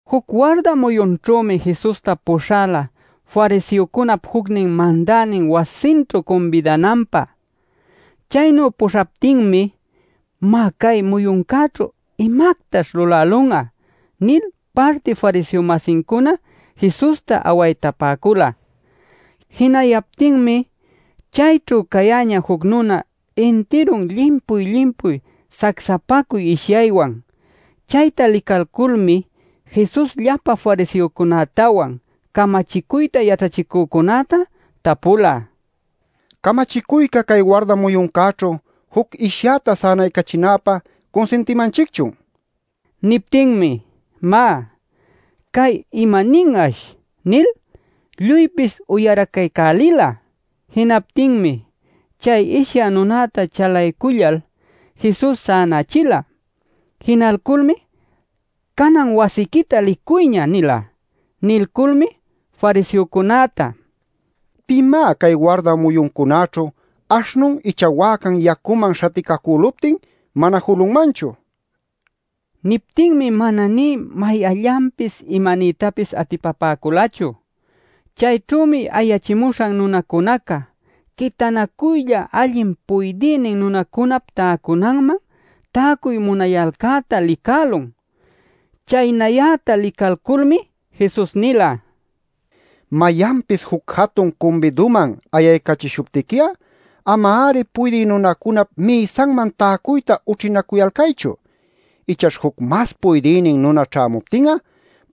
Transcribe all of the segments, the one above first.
Juc warda muyunćhümi Jesusta puśhala fariseocunap jucnin mandänin wasinćhu cumbidananpä. Chaynu puśhaptinmi: “Má, cay muyuncäćhu ¿imactash lulälun'a?” nil parti fariseo-masincuna Jesusta awaytapäcula. Jinayaptinmi chayćhu cayäñä juc nuna intirun llimpuy-llimpuy sacsapacuy ishyaywan. Chayta licalculmi Jesus llapa fariseocunätawan camachicuyta yaćhachïcücunäta tapula: “¿Camachicuyca cay warda muyuncäćhu juc ishyäta sänaycachinäpä cunsintimanchicchun?” nil. Niptinmi “Má, cay ¿imanin'ash?” nil lluypis uyaracaycälila. Jinaptinmi, chay ishyä nunäta chalaycullal Jesus sänächila. Jinalculmi “Canan wasiquita licuyña” nila. Nilculmi fariseocunäta: “¿Pimá cay warda muyuncunäćhu aśhnun icha wäcan yacuman śhaticacüluptin mana julunmanchu?” nila. Niptinmi mana nï mayanllanpis imaniytapis atipapäculachu. Chayćhümi ayachimuśhan nunacunaca quitanacuylla allin puydïnin nunacunap täcunanman täcuy munayalcäta licälun. Chaynayäta licalculmi Jesus nila: “Mayanpis juc jatun cumbiduman ayaycachishuptiqui'a ama-ari puydï nunacunap mïsanman täcuyta ućhinacuyalcaychu. Ichaćh juc mas puydïnin nuna ćhämuptin'a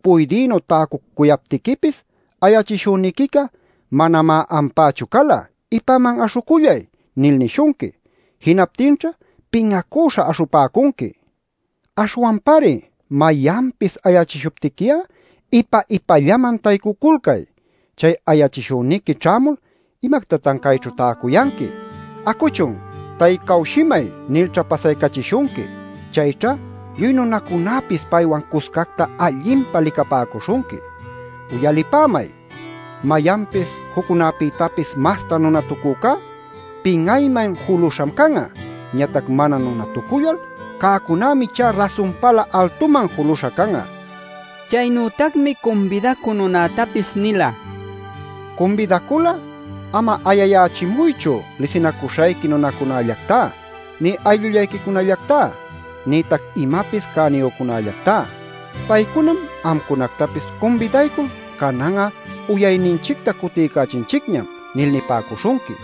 puydïnu täcucuyaptiquipis ayachishüniquica ‘Manamá ampächu cala. Ipaman aśhucullay’ nil nishunqui. Jinaptinćha pin'acüśha aśhupäcunqui. “Aśhwanpari mayanpis ayachishuptiqui'a ipa-ipallaman taycuculcay. Chay ayachishüniqui ćhämul ‘¿Imactatan cayćhu täcuyanqui? Acuchun, taycawshimay’ nilćha pasaycachishunqui. Chayćha lluy nunacunäpis paywan cuscacta allinpa licapäcuśhunqui. “Uyalipämay, mayanpis juccunapïtapis masta nunatucücá pin'ayman juluśham can'a. Ñatac mana nunatucullal cäcunämi ichá rasunpalä altuman juluśha can'a” nila. Chaynütacmi cumbidacü nunätapis nila: “Cumbidacul'a ama ayayächimuychu lisinacuśhayqui nunacunallactá, nï aylluyquicunallactá, nïtac imapis cäniyücunallactá. Paycunam amcunactapis cumbidaycul ‘Canan'a uyayninchicta cutiycachinchicñam’ nil nipäcuśhunqui.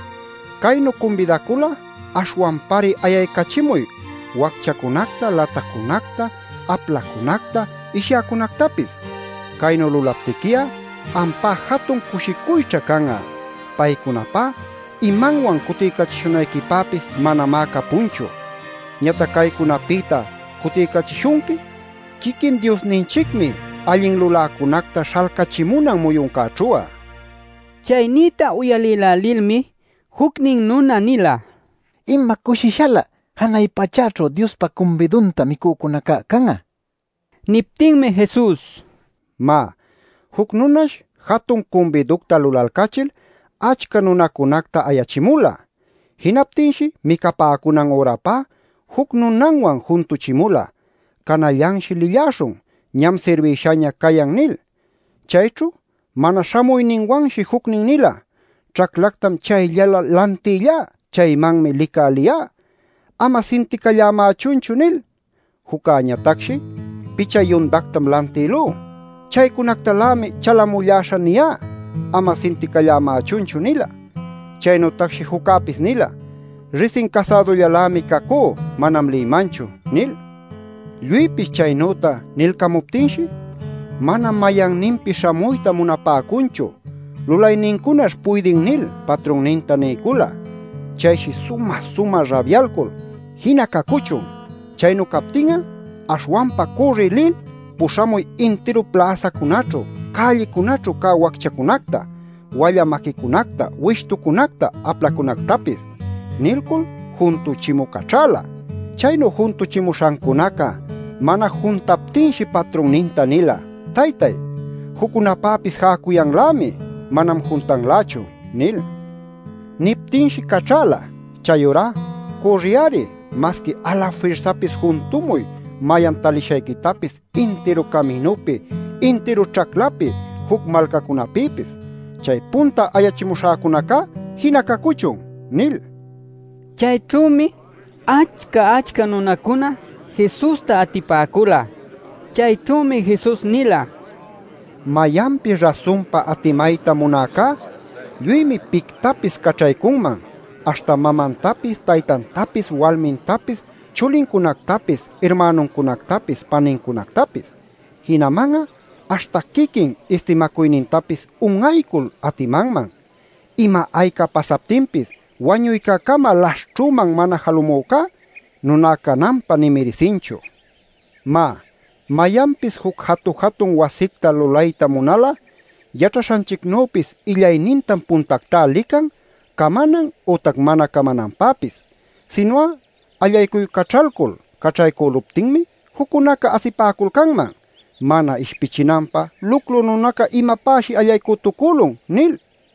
Caynu cumbidacul'a aśhwanpari ayaycachimuy wacchacunacta, latacunacta, aplacunacta, ishyäcunactapis. Caynu lulaptiqui'a ampá jatun cushicuyćha can'a. Paycunapá imanwan cutiycachishunayquipäpis manamá capunchu. Ñatac caycunapïta cutiycachishunqui quiquin Diosninchicmi allin luläcunacta śhalcachimunan muyuncäćhu'a” nil. Chay nïta uyalïlälilmi jucnin nuna nila: “¡Ima cushishalä janay pachäćhu Diospa cumbidunta micücunacá can'a!” nil. Niptinmi Jesus: “Má, juc nunash jatun cumbiducta lulalcachil achca nunacunacta ayachimula. Jinaptinshi micapäcunan ürapá juc nunanwan juntuchimula ‘Canallanshi lilläśhun. Ñam sirbïshaña cayan’ nil. Chayćhu mana śhamuyninwanshi jucnin nila: ‘Ćhaclactam chayllalä lantillá. Chaymanmi licä liyá. Ama sinticallämächunchu’ nil. Juccäñatacshi: ‘Picha yundactam lantïlú. Chaycunactalämi chalamulläśhä niyá. Ama sinticallämächunchu’ nila. Chaynütacshi juccäpis nila: ‘Risin casädullalämi cacú. Manam lïmanchu’ nil. “Lluypis chaynüta nilcamuptinshi: ‘Manam mayanninpis śhamuyta munapäcunchu’ lulaynincunash puydin nil patrunninta niycula. Chayshi sumä-sumä rabyalcul: ‘Jina cacuchun, chaynu captin'a. Aśhwanpa cürriy lil, puśhamuy intiru pläsacunäćhu, cällicunäćhu cä wacchacunacta, wallä maquicunacta, wishtucunacta, aplacunactapis’ nilcul juntuchimü caćhäla. Chaynu juntuchimuśhancunaca mana juntaptinshi patrunninta nila: ‘Taytay, juccunapäpis jäcuyanlämi. Manam juntanlächu’ nil. “Niptinshi caćhäla: ‘Chayurá cürriy-ari. Masqui alafirsapis juntumuy mayan talishayquitapis intiru caminupi, intiru ćhaclapi, juc malcacunapïpis. Chay punta ayachimuśhäcunacá jina cacuchun’ nil” nila. Chayćhümi achca-achca nunacuna Jesusta atipäcula. Chayćhümi Jesus nila: “Mayanpis rasunpa atimayta munäcá, lluymi pictapis caćhaycunman, aśhta mamantapis, taytantapis, walmintapis, chulincunactapis, irmänuncunactapis, panincunactapis. Jinaman'a aśhta quiquin istimäcuynintapis un'aycul atimanman. Ima-ayca pasaptinpis wañuycäcama laśhćhüman mana jalumücá nuná cananpä nï mirisinchu. Má, mayanpis juc jatu-jatun wasicta lulayta munal'a yaćhaśhanchicnüpis illaynintam puntactá lican camanan ütac mana camananpäpis. Sinu'a allaycuycaćhalcul caćhaycüluptinmi juccunaca asipäculcanman ‘Mana ishpichinanpä luclu nunaca imapäshi allaycütucülun’ nil.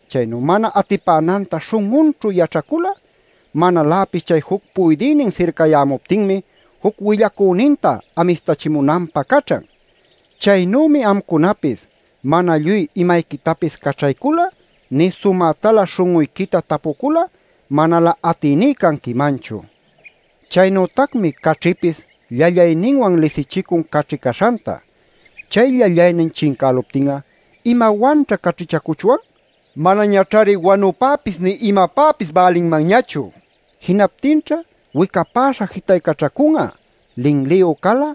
Chaynu mana atipänanta śhun'unćhu yaćhacul'a manaläpis chay juc puydïnin sircayämuptinmi juc willacüninta amistachimunanpä caćhan. Chaynümi amcunapis mana lluy imayquitapis caćhaycul'a nï sumätalä śhun'uyquita tapucul'a manalä atïní canquimanchu. “Chaynütacmi caćhipis llallayninwan lisichicun caćhi caśhanta. Chay llallaynin chincäluptin'a ¿imawanćha caćhichacuchwan? Manañaćhari wanupäpis nï imapäpis bälinmanñachu. Jinaptinćha wicapäśha jitaycaćhacun'a. “Linliyu cal'a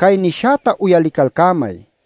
cay nishäta uyalicalcämay” nil.